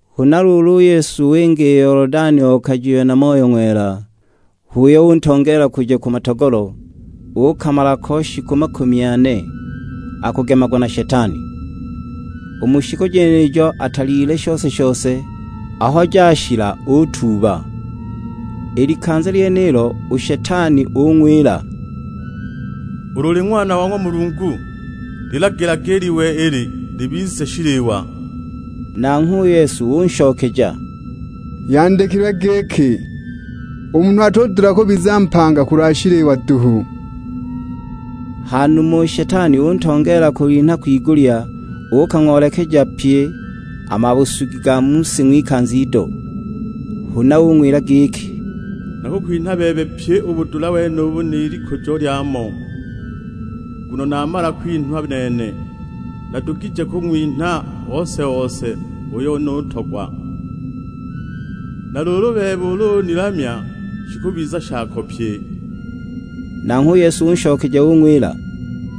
Huna luulu u Yesu winga i Yolodani okajiwe na Moyo Ng'wela; h'uyo untongeela kuja ku matogolo, uukamala ko shiku makumi ane, akugemagwa na Shetani. U mu shiku jenijo atalyile shose-shose; aho jashila utuuba. I likanza lyenilo, u Shetani ung'wila, "Ulu uli Ng'wana wa ng'wa Mulungu lilagilage i liwe ili libize shiliwa." Nanghwe u Yesu unshokeja, "Yandikilwe giki, 'U munhu atudula kubiza mpanga kulwa shiliwa duhu.' " Ha numa u Shetani untongeela kulinha kwigulya, uukang'oolekeja pye a mabusugi ga mu si ng'wikanza ido. Huna ung'wila giki, "Nakukwinha bebe pyi u budula wenubu ni likujo lyamo, nguno namala kwinhwa nene, nadugije kung'winha ose-ose uyo nutogwa. Na luulu u bebe ulu unilamya, shikubiza shako pye." Nanghwe u Yesu unshokeja ung'wila,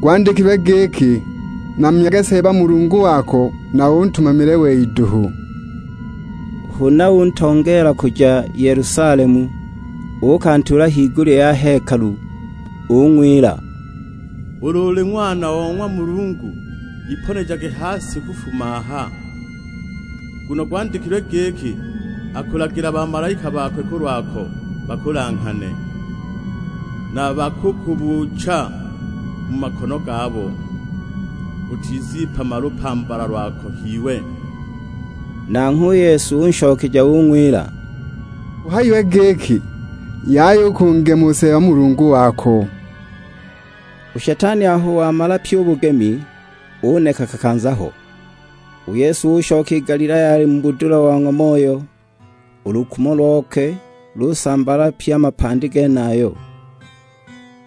"Gwandikilwe giki, 'Namyage Seeba Mulungu wako, na untumamile wei duhu!' " Huna untongeela kuja Yelusalemu, uukantuula higulya ya hekalu; ung'wila, "Ulu uli Ng'wana o ng'wa Mulungu iponejage ha si kufuma aha! Nguno gwandikilwe giki, 'Akulagila bamalaika bakwe kulwako, bakulanghane. Na bakukubuucha mu makono gabo, utizipama lupambala lwako h'iwe.' " Nanghwe u Yesu unshokeja ung'wila, "Guhayiwe giki, 'Yaya u kungema u Seeba Mulungu wako.' " U shetani aho wamala pyi u bugemi, uneka kakanza ho. U Yesu ushoka i Galilaya ali mu budula bo ng'wa Moyo; u lukumo lokwe lusambaala pye a mapandi genayo.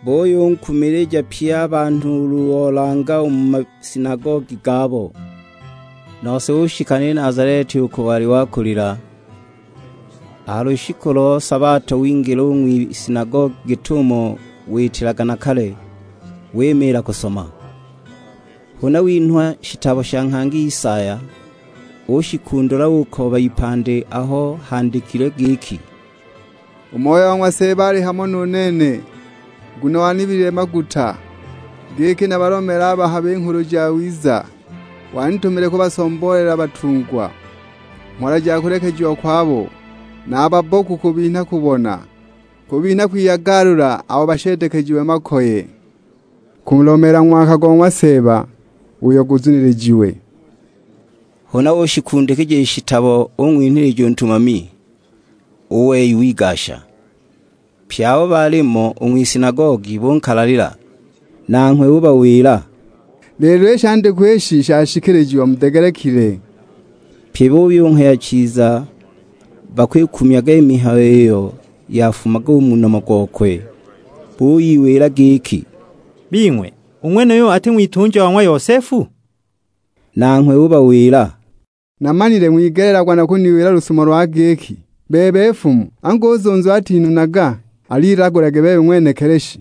Buyunkumilija pye a banhu ulu olanga u mu masinagogi gabo. Nose ushika ni Nazaleti uko wali wakulila; a ha lushiku lo sabato wingila u ng'wisinagogi git'umo witilaga na kale, wimiila kusoma. Huna winhwa shitabo sha nghangi Isaya, ushikundula ukooba ipandi aho handikilwe giki, "U Moyo wa ng'wa Seeba ali hamo nu nene, nguno wanibilile maguta giki nabalomeele a bahabi Nghulu Jawiza. Wanitumile kubasomboolela batungwa mhola ja kulekejiwa kwabo, na a babboku kubinha kubona; kubinha kwiyagalula abo basheedekejiwe makoye. Kulomeela ng'waka go ng'wa Seeba uyo guzunilijiwe." Huna ushikundikija i shitabo ung'winhilija u ntumami; u wei wigasha. Pye abo baalimo u ng'wisinagogi bunkalalila. Nanghwe ubawila, "Lelo i shandikwa ishi shashikilijiwa mudegelekile." Pye buyunghaya chiza bakwikumyaga i mihayo iyo yafumaga u mu nomo gokwe; buyiwila giki, "Bing'we u ng'wenuyu ati ng'witunja wa ng'wa Yosefu?" Nanghwe ubawila, "Namanile ng'wigeleelagwa na kuniwila lusumo lwa giki, 'Bebe nfumu, angu u zunzu atinunaga; al'ilagulage bebe ng'wenekili shi.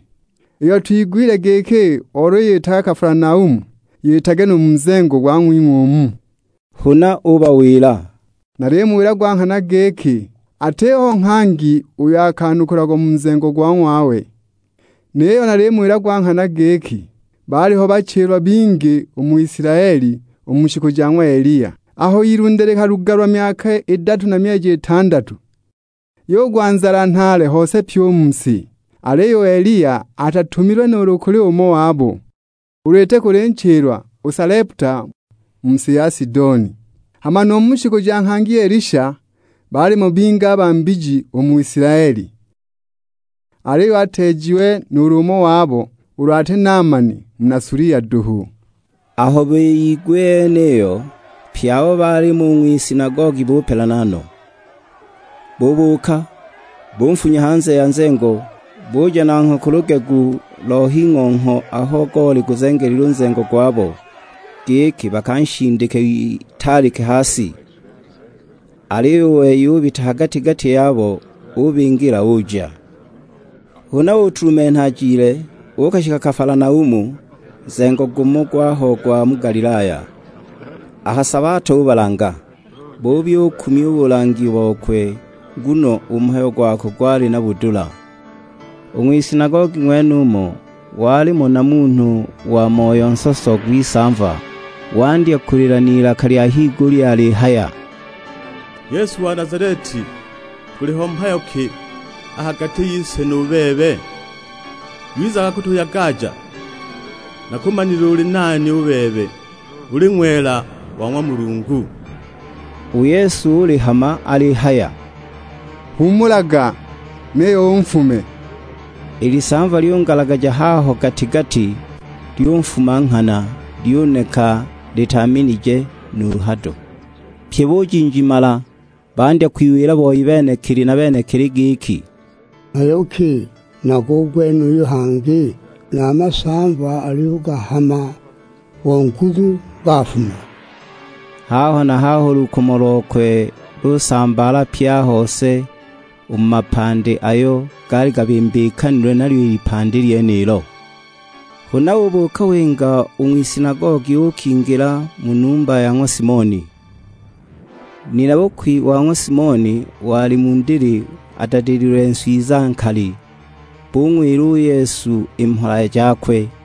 Iyo twigwile giki oluyitaga Kafalanaumu, yitage nu mu nzengo gwa ng'wing'we umu!' " Huna ubawila, "Nalimuwila gwa nghana giki, atiho nghangi uyo akanukulagwa mu nzengo go ng'wawe. Niyo nalimuwila gwa nghana giki baaliho bachilwa bingi u mu Isilaeli u mu shiku ja ng'wa Eliya, aho ilunde likalugalwa myaka idatu na myeji itandatu, yugwa nzala nhaale hose pyi u mu si. Aliyo u Eliya atatumilwe nuulu kuli umo wabo, ulu iti kuli nchilwa o Saleputa, mu si ya Sidoni. Hama nu mu shiku ja nghangi Elisha, baalimo bingi a ba mbiji u mu Isilaeli, aliyo ateejiwe nuulu umo wabo, ulu ati Naamani muna Sulia duhu!" Aho biyigwa i yeniyo, pye abo baalimo u ng'wisinagogi bupelana no. Bubuuka, bunfunya hanze ya nzengo, buja nanghwe ku lugegu lo h'ing'ongho aho goli guzengelilwe u nzengo gwabo, giki bakanshindike witaalike ha si. Aliyo u wei ubita ha gati-gati yabo, ubingila, uja. Huna utulumenha ajile, uukashika Kafalanaumu, nzengo gumo gwaho gwa mu Galilaya; a ha sabato ubalanga. Buyubukumya u bulangi bokwe, nguno u mhayo gwakwe gwali na budula. U ng'wisinagogi ng'wenumo walimo na munhu wa moyo nsoso gw'isamva; wandya kulila n'ilaka lya higulya alihaya, "Yesu wa Nazaleti, guliho mhayo ki a ha gati yise nu bebe? Wizaga kutuyagaja? Nakumanile uli nani u bebe, uli Ng'wela wa ng'wa Mulungu!" U Yesu ulihama alihaya, "Huumulaga, niyo unfume!" I lisamva lyungalagaja haho gati-gati, lyunfuma nghana, lyuneka litaaminije nuulu hado. Pye bujinjimala, bandya kwiwila boi benekili na benekili giki, "Mhayo ki nago u gwenuyu hangi? Na a masamva aliyugahama bo nguzu gafuma!" Haho na haho u lukumo lokwe lusambaala pye a hose u mu mapandi ayo gaali gabimbikanilwe nalyo i lipandi lyenilo. Huna ubuuka winga u ng'wisinagogi uukingila mu numba ya ng'wa Simoni. Nina-bukwi wa ng'wa Simoni wali mu ndili adadililwe nswiza nkali, bung'wila u Yesu i mhola jakwe.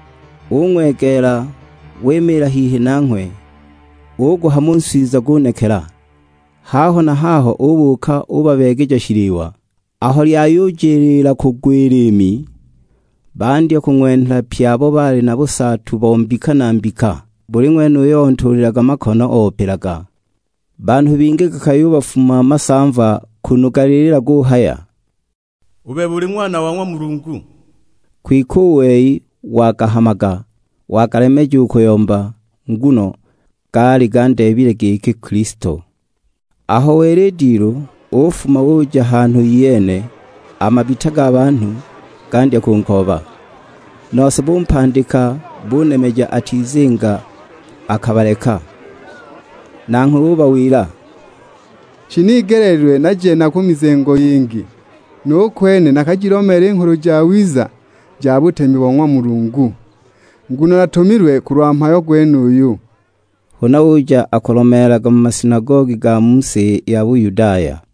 Ung'wegeela, wimiila hihi nanghwe, uguhama u nswiza gunekela; haho na haho ubuuka ubabeegeja shiliwa. Aho lyayujiliila kugwa i liimi, bandya kung'wenhela pye abo baali na busaatu bo mbika na mbika. Buli ng'wene uyo ontuulilaga makono opilaga. Banhu bingi gakayubafuma masamva kunu galilila guhaya, "U bebe uli Ng'wana wa ng'wa Mulungu!" Kwike u wei wagahamaga, wagalemeja u kuyomba, nguno gaali gandeebile giki Kilisto. Aho wela i dilu, ufuma uja hanhu iyene, a mabita ga banhu gandya kunkooba, nose bumpandika bunemeja atizinga akabaleka. Nanghwe ubawila, "Shinigeleelilwe naje na ku mizengo yingi, nu kwene nakajilomeele i Nghulu Jawiza ja butemi bo ng'wa Mulungu; nguno natumilwe kulwa mhayo gwenuyu." Huna uja akulomeelaga mu masinagogi ga mu si ya Buyudaya.